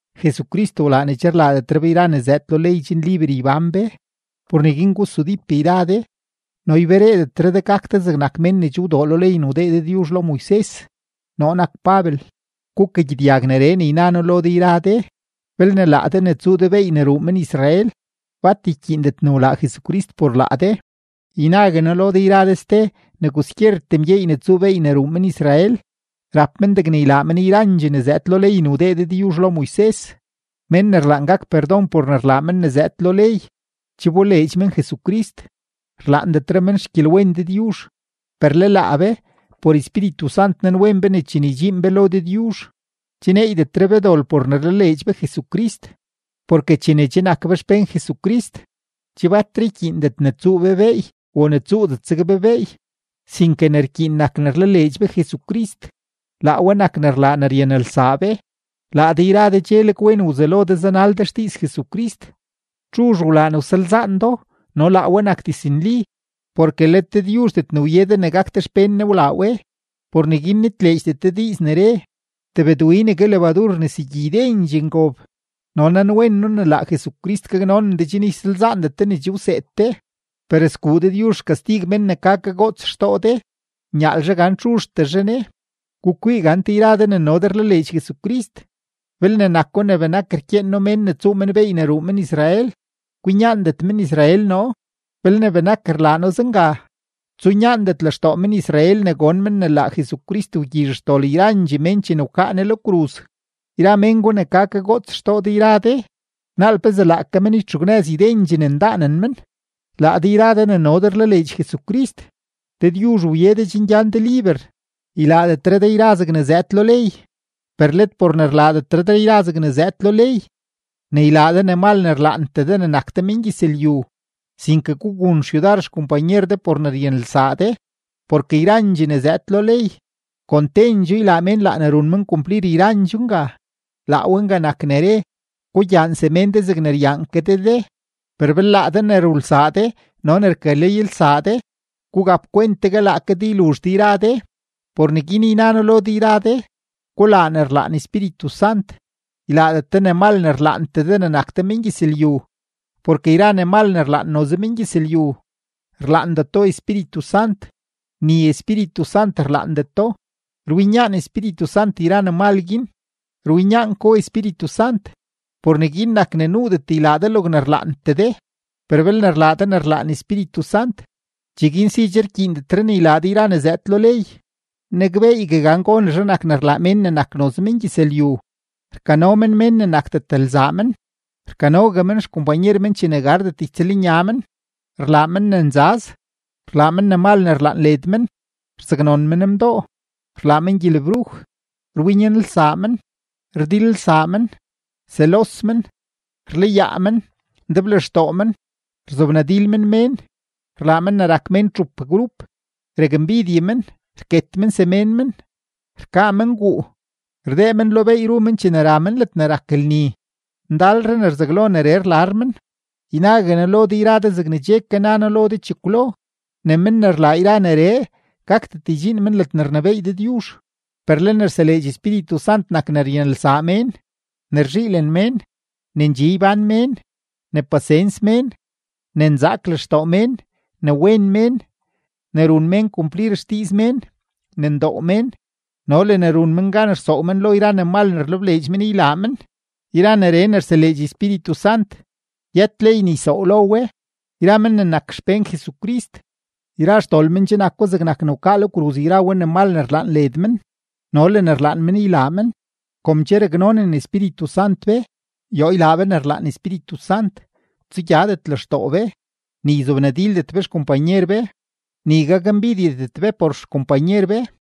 Jesucrist wlaa ne che rlaadetre be yra ne zëëd lo ley chen liber ybán be. Por neguin gusudíp yra de no ybereedetre de gak de zegnak mén ne che wdoo lo ley ne wdee Dëdyuzh lo Moises. Noo nak Pabel, gukagyedyag neree ne yna noo lo de yra de: Belne laa de ne tsuu de beey ne ruu men-Israel, bat ykyiindet ne wlaa Jesucrist por laa de. Ynague noo lo de yra de ste ne kwaskyertee mgyeey ne tsuu beey ne ruu men-Israel, rap men degne ylaa men yrandxee ne zëëd lo ley ne wdee Dëdyuzh lo Moises. Mén ne rlaan gak perdon por ne rlaa men ne zëëd lo ley, che wboleedx men Jesucrist, rlaandetre men xgyelwen Dëdyuzh. Per le laa be, por Espíritu Sant nanwen be ne chene ydxiin be lo Dëdyuzh, che neeydetre be dol por ne rlaleedx be Jesucrist. Porke chene che nak be xpén Jesucrist, che batre rkyiindet ne tsuu be beey o ne tsuudet zeg be beey, sinke ne rkyiin nak ne rlaleedx be Jesucrist; laa we nak ne rlaa ne ryanelsaa be. Laa de yra de cheleg wen wzelo de zanal de xdiiz Jesucrist. ¿Txuzh wlaa ne wsalzaan do no laa we nak diznli? Porke let Dëdyuzhdet ne wye de ne gak de xpén Ne wlaa we. Por neguin nitleedxdet de diiz ne re: “Tebëdwinegue lebadur rnesegyi ydendxee ngob.” Noo nanwen noo ne laa Jesucrist gaknonen de chen ysalzaandet de ne che wseed de; per sguu Dëdyuzh xkastig men ne ka kagoots xtoo de, nyaalzhe gan txuzhtezhe ne. Gukwii gante yra de ne no de rlaleedx Jesucrist, belne nako ne benak rkyeen noo mén ne tsuu men beey ne ruu men-Israel, kwinyaandet men-Israel noo. Belne benak rlaa noo zenga, tsunyaandet lextoo men-Israel ne gon men ne laa Jesucrist wgyizh xdol yrandxee mén chene wkaa Ne lo kruz. Yra mén gwa ne ka kagoots xtoo de yra de, ¡naal pezee laake men ytxugnëz ydendxee ne ndaanen men! Laa de yra de ne no de rlaleedx Jesucrist, Dëdyuzh wye de chen gyan de liber, ylaadetre de yra zegne zëëd lo ley, per let por ne rlaadetre de yra zegne zëëd lo ley, ne ylaa de ne mal ne rlaantee de ne nak de mengyëzlyu, sinke gugun xyudar xkompanyer de por ne ryanelsaa de. Porke yrandxee ne zëëd lo ley, kon tendxoo ylaa mén laa ne run men kumplir yrandxoo nga; laa we nga nak ne re: “Gugyaan semén de zegne ryaan ke de de.” Per belne laa de ne rulsaa de no ne rkaleylsaa de, gugap kwent tegue laake de yluzh de yra de. Por neguin yna noo lo de yra de: Gulaa ne rlaan Espíritu Sant, ylaadet de ne mal ne rlaantee de ne nak de mengyëzlyu. Porke yra ne mal ne rlaan noze mengyëzlyu, rlaandeto Espíritu Sant, ni Espíritu Sant rlaandeto. Rwinyaan Espíritu Sant yra ne mal guin, rwinyaan ko Espíritu Sant; por neguin nak ne nuudet ylaa de logne rlaantee de. Per belne rlaa de ne rlaan Espíritu Sant, cheguin si che rkyiindetre ne ylaa de yra ne zëëd lo ley. Nakbeeygue gan gonezhe nak ne rlaa mén ne nak noze mengyëzlyu: rkano men mén ne nakdet lzaa men, rkanogue xkompanyer men chene gardet ytsëlnya men, rlaa men ne nzaz, rlaa men ne mal ne rlaan led men, rzaknon men mdoo, rlaa men gyelebruj, rwinyanelsaa men, rdilelsaa men, selos men, rlayaa men, ndeblextoo men, rzobnadil men mén, rlaa men ne rak mén txup grup, rakmbidye men, rket men semén men, rkaa men guu, rdee men lo beey ru men chene ra men ledne rak lni, ndalre ne rzaglo neree rlar men. Ynague noo lo de yra de zegne che ke na noo chekwlo, ne men ne rlaa yra neree, gakdet ydxiin men ledne rnebééy Dëdyuzh. Per le ne rseleedx Espíritu Sant nak ne ryanelsaa mén, ne rzhiilen mén, ne ndxi ybán mén, ne pasens mén, ne nzaak lextoo mén, ne wen mén, ne run mén kumplir xdiiz mén, ne ndoo mén, no le ne run mén gan rsoow men lo yra ne mal ne rlebleedx men ylaa men. Yra neree ne rseleedx Espíritu Sant, yët ley ne ysoow lo we. Yra men ne nak xpén Jesucrist, yra xdol men che nako zegnak ne wkaa lo kruz yra we ne mal ne rlaan led men no le ne rlaan men ylaa men. Kom che raknonen Espíritu Sant be, yoo ylaa be ne rlaan Espíritu Sant. Tsugyadet lextoo be, ni yzobnadildet be xkompanyer be, ni gakmbidyedet be por xkompanyer be.